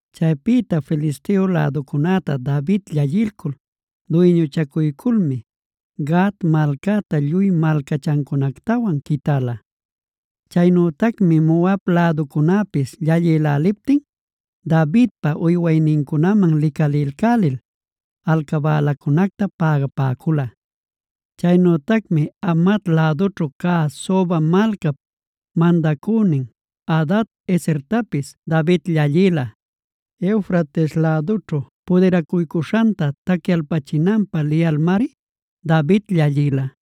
Chaypïta Filisteo läducunäta David llallilcul, duyñuchacuyculmi Gat malcacta lluy malcachancunactawan quitäla. Chaynütacmi Moab läducunäpis llallïläliptin, Davidpa uywaynincunaman licalilcälil alcabälacunacta pägapäcula. Chaynütacmi Hamat lädućhu cä Soba malcap mandacünin Hadad-ezertapis David llallïla. Eufrates lädućhu pudiracuycuśhanta tacyachinanpä liyalmari David llallïla.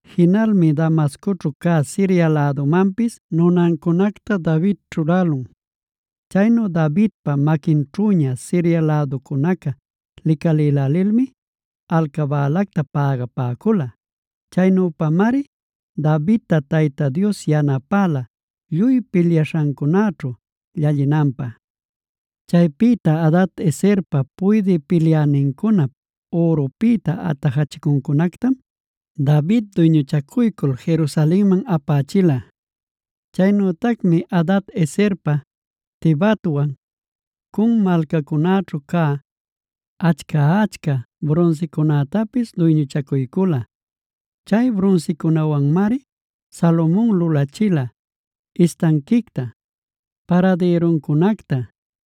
Jinalmi Damascoćhu cä Siria lädumanpis nunancunacta David ćhulälun. Chaynu Davidpa maquinćhüña Siria läducunaca licalilälilmi, alcabälacta pagapäcula. Chaynüpamari Davidta Tayta Dios yanapäla lluy pilyaśhancunaćhu llallinanpä. Chaypïta Hadad-ezerpa puydï pilyänincunap ürupïta atajachicuncunactam, David duyñuchacuycul Jerusalenman apächila. Chaynütacmi Hadad-ezerpa Tibhatwan Cun malcancunaćhu cä, achca-achca brunsicunätapis duyñuchacuycula. Chay brunsicunäwanmari Salomon lulachila istanquicta, paradïruncunacta,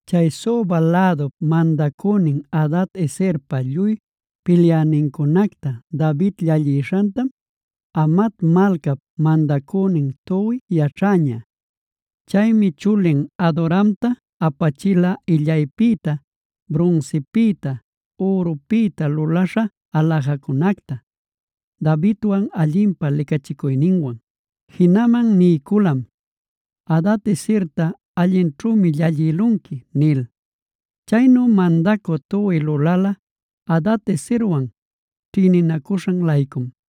Chay Soba lädup mandacünin Hadad-ezerpa lluy pilyänincunacta David llallishantam, Hamat malcap mandacünin Toi yaćhäña. Chaymi chulin Adoramta apachila illaypïta, brunsipïta, ürupïta luläśha aläjacunacta, Davidwan allinpä licachicuyninwan. Jinaman niyculam: “Hadad-ezerta allićhümi llallïlanqui” nil. Chaynu mandacü Toi lulala Hadad-ezerwan ćhïninacuśhan-laycum.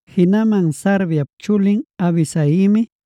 Jinaman Sarviap chulin Abisaimi,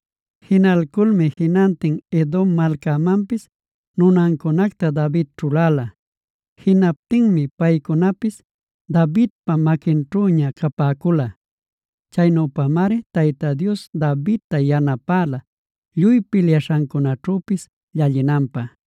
Jinalculmi jinantin Edom malcamanpis nunancunacta David ćhuläla. Jinaptinmi paycunapis Davidpa maquinćhüña capäcula. Chaynüpamari Tayta Dios Davidta yanapäla lluy pilyaśhancunaćhüpis llallinanpä.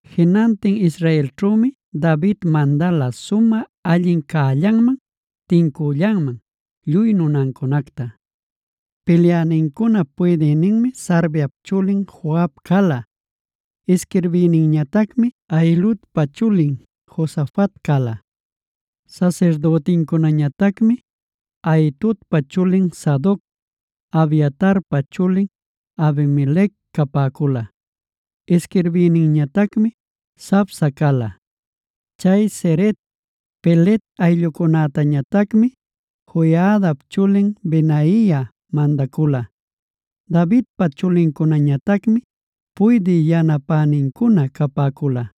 Jinantin israelćhümi David mandala sumä allin cällanman, tincüllanman lluy nunancunacta. Pilyänincunap puydïninmi Sarviap chulin Joab cala; isquirbïninñatacmi Ahiludpa chulin Josafat cala. Sasirdütincunañatacmi Ahitobpa chulin Sadoc, Abiatarpa chulin Abimelec capäcula. Isquirbïninñatacmi Savsa cala. Chay Ceret, Pelet ayllucunätañatacmi Joiadapa chulin Benaia mandacula. Davidpa chulincunañatacmi puydï yanapänincuna capäcula.